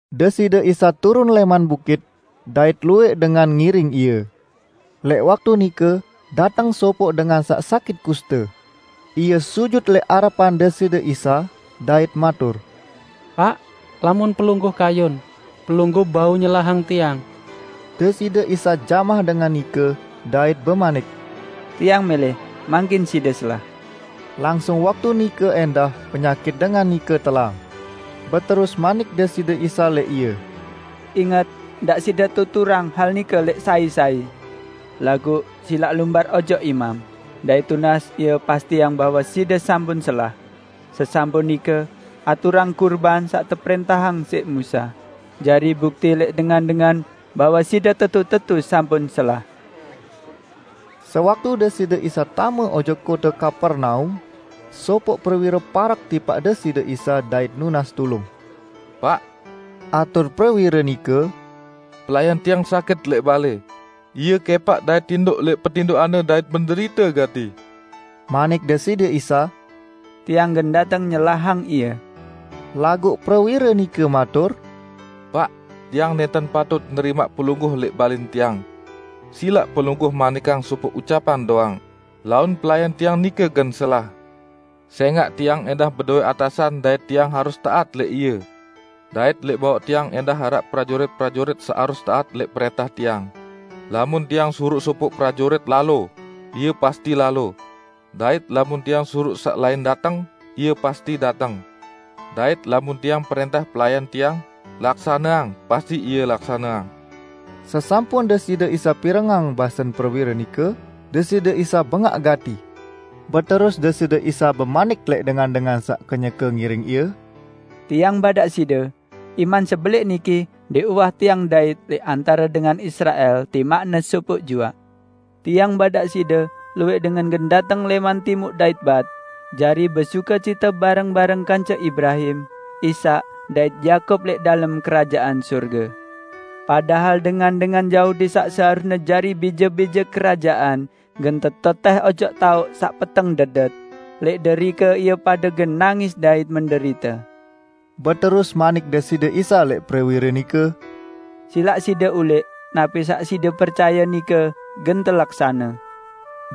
Deside Isa turun lẽman bukit, dait luwẽq dengan ngiring Ie. Lẽq waktu nike, dateng sopoq dengan saq sakit kuste. Ie sujut lẽq arepan Deside Isa, dait matur, "Paq, lamun Pelungguh kayun, Pelungguh bau nyelahang tiang." Deside Isa jamah dengan nike, dait bemanik, "Tiang mẽlẽ, mangkin side selah!" Langsung waktu nike ẽndah penyakit dengan nike telang. Beterus manik Deside Isa lẽq ie, "Inget, ndaq side tuturang hal nike lẽq sai-sai. Laguq silaq lumbar ojok imam, dait tunas ie pastiang bahwe side sampun selah. Sesampun nike, aturang kurban saq teprẽntahang siq Musa, jari bukti lẽq dengan-dengan bahwe side tetu-tetu sampun selah!" Sewaktu Deside Isa tame ojok kote Kapernaum, sopoq prewire parek tipaq Deside Isa dait nunas tulung, "Paq," atur prewire nike, "pelayan tiang sakit lẽq balẽ. Ie kẽpaq dait tindoq lẽq petindoqanne dait menderite gati." Manik Deside Isa, "Tiang gen dateng nyelahang ie." Laguq prewire nike matur, "Paq, tiang nẽnten patut nerimaq Pelungguh lẽq balẽn tiang. Silaq Pelungguh manikang sopoq ucapan doang, laun pelayan tiang nike gen selah. Sẽngaq tiang ẽndah bedowẽ atasan dait tiang harus taat lẽq ie. Dait lẽq bawaq tiang ẽndah araq prajurit-prajurit saq harus taat lẽq prẽntah tiang. Lamun tiang suruq sopoq prajurit, 'Lalo!' ie pasti lalo. Dait lamun tiang suruq saq lain, 'Dateng!' ie pasti dateng; dait lamun tiang prẽntah pelayan tiang, 'Laksaneang!' pasti ie laksaneang." Sesampun Deside Isa pirengang basen prewire nike, Deside Isa bengaq gati. Beterus Deside Isa bemanik lẽq dengan-dengan saq kenyeke ngiring Ie, "Tiang badaq side, iman sebelẽq niki ndẽq uwah Tiang ndait lẽq antare dengan Israel timaqne sopoq juaq! Tiang badaq side, luwẽq dengan gen dateng lẽman Timuq dait Bat jari besukecite bareng-bareng kance Ibrahim, Ishak dait Yakub lẽq dalem Kerajaan Sorge. Padahal dengan-dengan Yahudi saq seharusne jari bije-bije Kerajaan gen tetetẽh ojok taoq saq peteng dedet, lẽq derike ie pade gen nangis dait menderite." Beterus manik Deside Isa lẽq prewire nike, "Silaq side ulẽq, napi saq side percaye nike gen telaksane."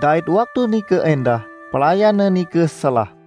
Dait waktu nike ẽndah, pelayanne nike selah.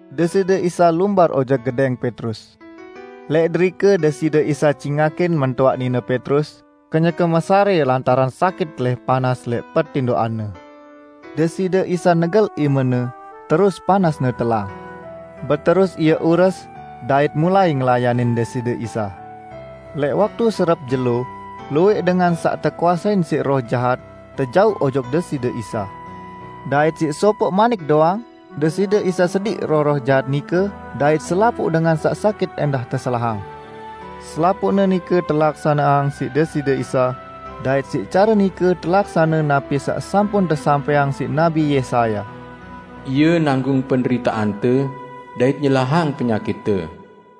Deside Isa lumbar ojok gedẽng Petrus. Lẽq derike Deside Isa cingakin mentoaq nine Petrus kenyeke mesarẽ lantaran sakit telih panas. Deside Isa negel imene, terus panasne telang. Beterus ie ures dait mulai ngelayanin Deside Isa. Lẽq waktu serep jelo, luwẽq dengan saq tekuasein siq roh jahat tejauq ojok Deside Isa. Dait siq sopoq manik doang, Deside Isa sediq roh-roh jahat nike dait selapuq dengan saq sakit ẽndah teselahang. Selapuqne nike telaksaneang siq Deside Isa, dait siq care nike telaksane napi saq sampun tesampẽang siq Nabi Yesaya, "Ie nanggung penderiteante, dait nyelahang penyakitte."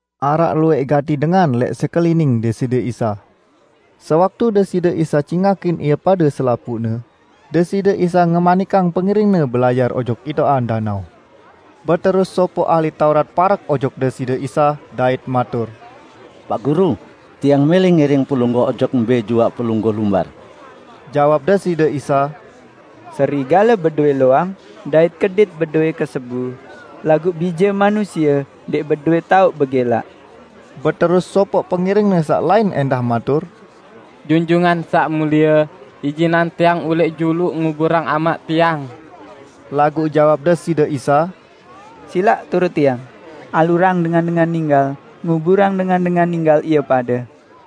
Araq luwẽq gati dengan lẽq sekelining Deside Isa. Sewaktu Deside Isa cingakin ie pade selapuqne, Deside Isa ngemanikang pengiring-Ne belayar ojok itoqan danao. Beterus sopoq ahli Taurat parek ojok Deside Isa, dait matur, "Paq Guru, tiang mẽlẽ ngiring Pelungguh ojok mbẽ juaq Pelungguh lumbar!" Jawab Deside Isa, "Serigale bedowẽ loang, dait kedit bedowẽ kesebu, laguq Bije Manusie ndẽq bedowẽ taoq begẽlaq." Beterus sopoq pengiring-Ne saq lain ẽndah matur, "Junjungan Saq Mulie, ijinang tiang ulẽq juluq nguburang amaq tiang." Laguq jawab Deside Isa, "Silaq turut Tiang, alurang dengan-dengan ninggal nguburang dengan-dengan ninggal ie pade."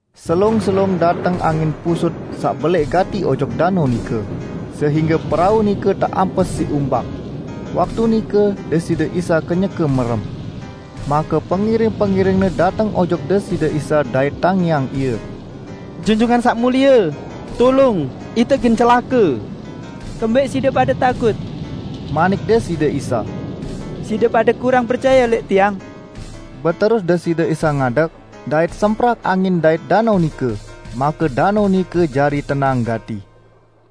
Selung-selung dateng angin pusut saq belẽq gati ojok danao nike, sehingge perau nike teampes siq umbak. Waktu nike Deside Isa kenyeke merem. Make pengiring-pengiring-Ne dateng ojok Deside Isa dait tangiang Ie. "Junjungan Saq Mulie! Tulung! Ite gen celake!" "Kembẽq side pade takut?" manik Deside Isa. "Side pade kurang percaye lẽq Tiang!" Beterus Deside Isa ngadeg, dait semprak angin dait danao nike, make danao nike jari tenang gati.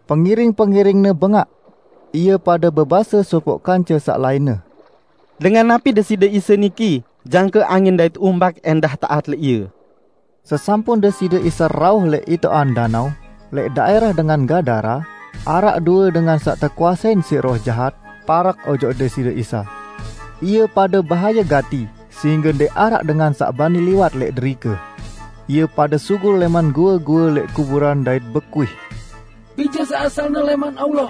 Pengiring-pengiring-Ne bengaq. Ie pade bebase sopoq kance saq lainne, "Dengan napi Deside Isa niki jangke angin dait umbak ẽndah taat lẽq Ie!" Sesampun Deside Isa rauh lẽq itoqan danao, lẽq daẽrah dengan Gadara, araq due dengan saq tekuasein siq roh jahat parek ojok Deside Isa. Ie pade bahaye gati sehingge ndẽq araq dengan saq bani liwat lẽq derike. Ie pade sugul lẽman goe-goe lẽq kuburan dait bekuih, "Bije saq asalne lẽman Allah!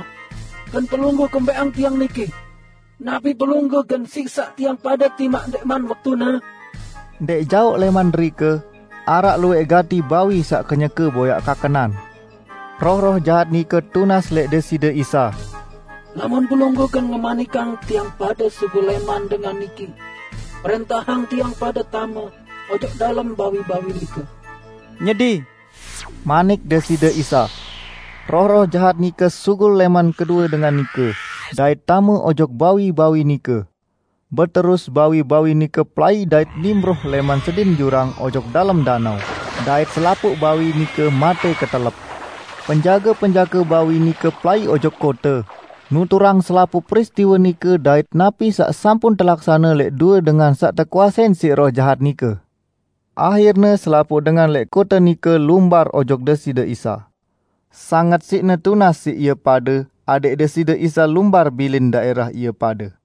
Gen Pelungguh kumbẽqang tiang niki? Napi Pelungguh gen siksaq tiang pade timaq ndẽqman waktune?" Ndẽq jaoq lẽman derike, araq luwẽq gati bawi saq kenyeke boyaq kakenan. Roh-roh jahat nike tunas lẽq Deside Isa, "Lamun Pelungguh gen ngemanikang tiang pade sugul lẽman dengan niki, prẽntahang tiang pade tame ojok dalem bawi-bawi nike." "Nyedi!" manik Deside Isa. Roh-roh jahat nike sugul lẽman kedue dengan nike, dait tame ojok bawi-bawi nike. Beterus bawi-bawi nike pelai dait nimproh lẽman sedin jurang ojok dalem danao, dait selapuq bawi nike matẽ ketelep. Penjage-penjage bawi nike pelai ojok kote, nuturang selapuq peristiwe nike dait napi saq sampun telaksane lẽq due dengan saq tekuasein siq roh jahat nike. Ahirne selapuq dengan lẽq kote nike lumbar ojok Deside Isa. Sanget siqne tunas siq ie pade adẽq Deside Isa lumbar bilin daẽrah ie pade.